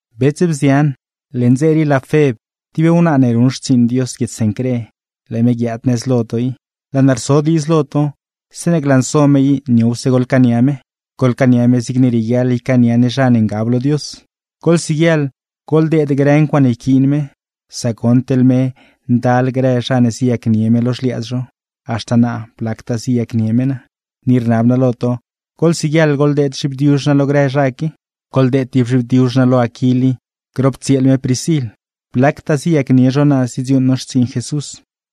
Bets, bzian, leṉ dze rii laa Feb, tib wnaa ne ruṉ xtsiiṉ Dios guiedz Cencré, laa me guiaad nëz lo to i. Laa naa rso diidz lo to, zeeṉe glanso me i niowse goḻcaania me, goḻcaania me zigne rieguiaḻ ycaania ne zha ne ngab lo Dios. Goḻsiguieḻ goḻdeed grë ncuaaṉe yquiin me; sac goṉ, teḻ me ndal grë zha ne ziyacnie me lo xliaadz zho, haxta naa blactaa ziyacnie me naa. Ni rnab naa lo to, goḻsiguieḻ goḻdeed zhibdiuzh naa lo grë zha qui. Goḻdeed tib zhibdiuzh naa lo Aquil i, grop tsieel me Priscil. Blactaa ziyacnie zho naa zidziuuṉ no xtsiiṉ Jesús,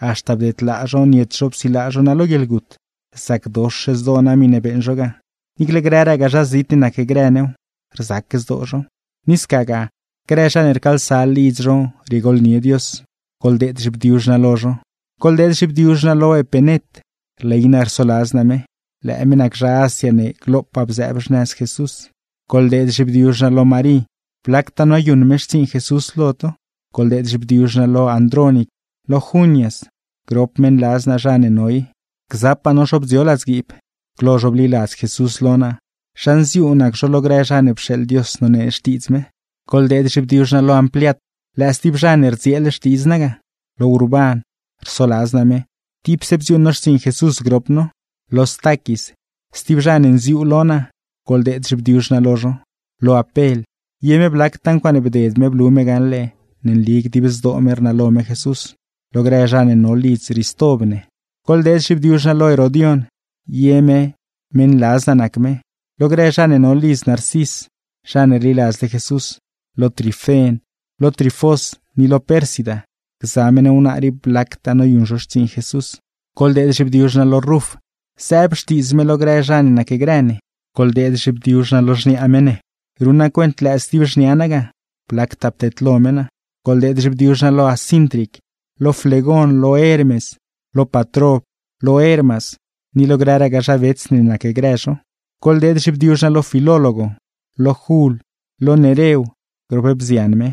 haxta bdedlaa zho niet zho psilaa zho naa lo guieḻgut. Rzacdox zdoo naa miṉe beeṉ zho ga, niicle grëragaa zha zit ne nacgrë new, rzac zdoo zhow. Ni scagaa, grë zha ne rcaalsa lidz zho riegooḻnie Dios, goḻdeed zhibdiuzh naa lo zho. Goḻdeed zhibdiuzh naa lo Epenet, rley naa rsoladz naa me; lëë me nac zha Asia ne glopaa bzëëb xnëz Jesús. Goḻdeed zhibdiuzh naa lo Marí, blactaa noyuṉ me xtsiiṉ Jesús lo to. Goḻdeed zhibdiuzh naa lo Andrónic, lo Junias, grop meṉladz naa zha ne no i; gzapaa no zho bdzio ladzguiib. Glo zho bliladz Jesús lo naa, zha nziuu nac zho lo grë zha ne pxeeḻ Dios nonee Xtiidz me. Goḻdeed zhibdiuzh naa lo Ampliat, lëë stib zha ne rdzieel xtidz naa ga; lo Urban, rsoladz naa me, tipse bdziuuṉ no xtsiiṉ Jesús grop no; lo Staquis, stib zha ne nziuu lo naa, goḻdeed zhibdiuzh naa lo zho; lo Apel, ye me blactaa ncuaaṉe bded me blu me gaṉle ne nli dib zdoo me rnalo me Jesús; lo grë zha ne no lidz Ristob ne. Goḻdeed zhibdiuzh naa lo Herodion, ye me meṉladz naa nac me; lo grë zha ne no lidz Narcis, zha ne rliladzle Jesús; lo Trifen, lo Trifós, ni lo Pérsida, gza meṉ wnaa rii blactaa noyuṉ zho xtsiiṉ Jesús. Goḻdeed zhibdiuzh naa lo Ruf, zëëb xtiidz me lo grë zha ne nacgrë ne; goḻdeed zhibdiuzh naa lo xniaa me ne, ruṉ naa cuent lëë stib xnia naa ga, blactaa pteedlo me naa. Goḻdeed zhibdiuzh naa lo Asíntric, lo Flegon, lo Hermes, lo Patrob, lo Hermas ni lo grëragaa zha bets ne nacgrë zho. Goḻdeed zhibdiuzh naa lo Filólogo, lo Jul, lo Nerew grop bzian me,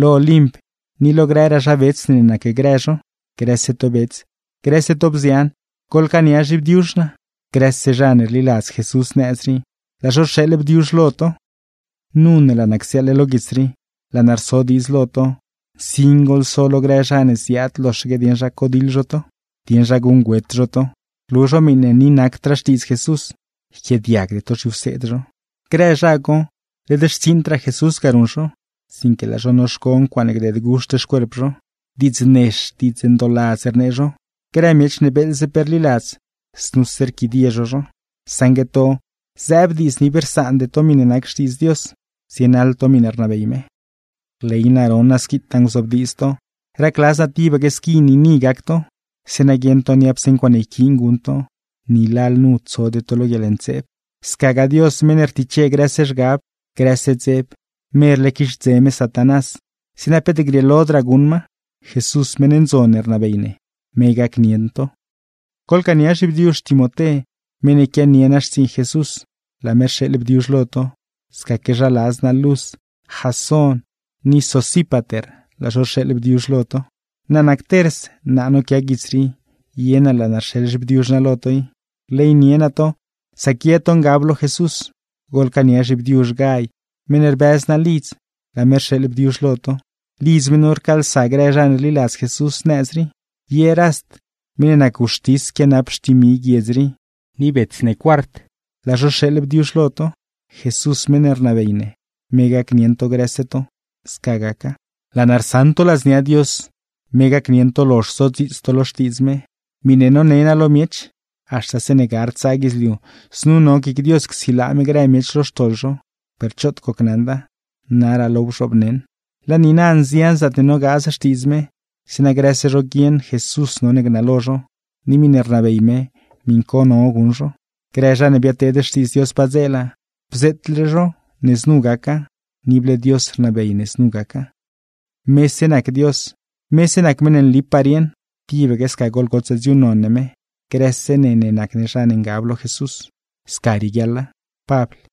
lo Olimp ni lo grëraa zha bets ne nacgrë zho. Grëse to bets, grëse to bzian, goḻcaania zhibdiuzh naa. Grëse zha ne rliladz Jesús nëz rii, laa zho rxeeḻ bdiuzh lo to. Nu ne laa naa csiaaḻle lo guits rii, laa naa rso diidz lo to, nsin goḻso lo grë zha ne ziaad loxaque dieṉ zha codiḻ zho to, dieṉ zha guṉgüet zho to, rlu zho miṉe ni nacdraa Xtiidz Jesús; yquiaadiagde to zhiwseed zho. Grë zha co, led xtsiiṉdraa Jesús ga ruṉ zho, sinque laa zho noxco ncuaaṉe gdeed guxt xcuerp zho. Diidz nex, diidz ndooladz rnee zho; grë miech ne beeḻze pe rliladz, znuse rquidie zho zho. Saṉgue to, zëëb diidz ne ib rsaande to miṉe nac Xtiidz Dios, zienaḻ to miṉe rnabey me. Rley naa ron naa squitaa nguzobdiidz to. Racladz naa tibaque squi niini gac to, zeeṉa guieṉ to niapse ncuaaṉe yquiin guṉ to, ni lalnu tsode to lo guieḻntseeb. Scagaa Dios meṉ ne rtiche grëse zhgab, grëse dzeb, merle quixdze me Satanás, zeeṉa peet grieelodraa guṉ ma. Jesús, meṉ ndzon ne rnabey ne, me gacnieṉ to. Goḻcaania zhibdiuzh Timoté, meṉ ne quianie naa xtsiiṉ Jesús, laa me rxeeḻ bdiuzh lo to; scaque zha ladz naa Lus, Jasón ni Sosípater, laa zho rxeeḻ bdiuzh lo to. (Naa nac Ters, naa noquia guits rii, ye naa laa naa rxeḻ zhibdiuzh naa lo to i. Rleynie naa to, sac ye to ngab lo Jesús. Goḻcaania zhibdiuzh Gay, meṉ ne rbëz naa lidz, laa me rxeeḻ bdiuzh lo to. Lidz me nu rcaalsa grë zha ne rliladz Jesús nëz rii. Ye Rast, meṉ ne nac wxtis quianap xtimi guiedz rii, ni bets ne Cuart, laa zho rxeeḻ bdiuzh lo to. Jesús meṉ ne rnabey ne, me gacnieṉ to grëse to. Sca gaca.) Laa naa rsaṉ to ladznia Dios, me gacnieṉ to lozh sodziits to lo Xtiidz me, miṉe none naa lo miech. Haxta zeeṉe gard tsaa guidzliu, znu no guic Dios csilaa me grë miech lo xtoḻ zho, per choot gocnaṉda, naraa laaw bzhoobneṉ. Laa niina, nzian zaatne nogaaz Xtiidz me, zeeṉa grëse zho guieṉ Jesús none gnalo zho, ni miṉe rnabey me miṉ co no guṉ zho. Grë zha ne biadteed xtiidz Dios padzeela, bzeetle zho ne znu gaca, ni ible Dios rnabey ne znu gaca. ¡Mese nac Dios, mese nac meṉ ne nlipaa rieṉ! ¡Tibaque sca goḻgotsaa dziuuṉnon ne me, grëse ne ne nac ne zha ne ngab lo Jesús! Sca rieguiaḻa. Pabl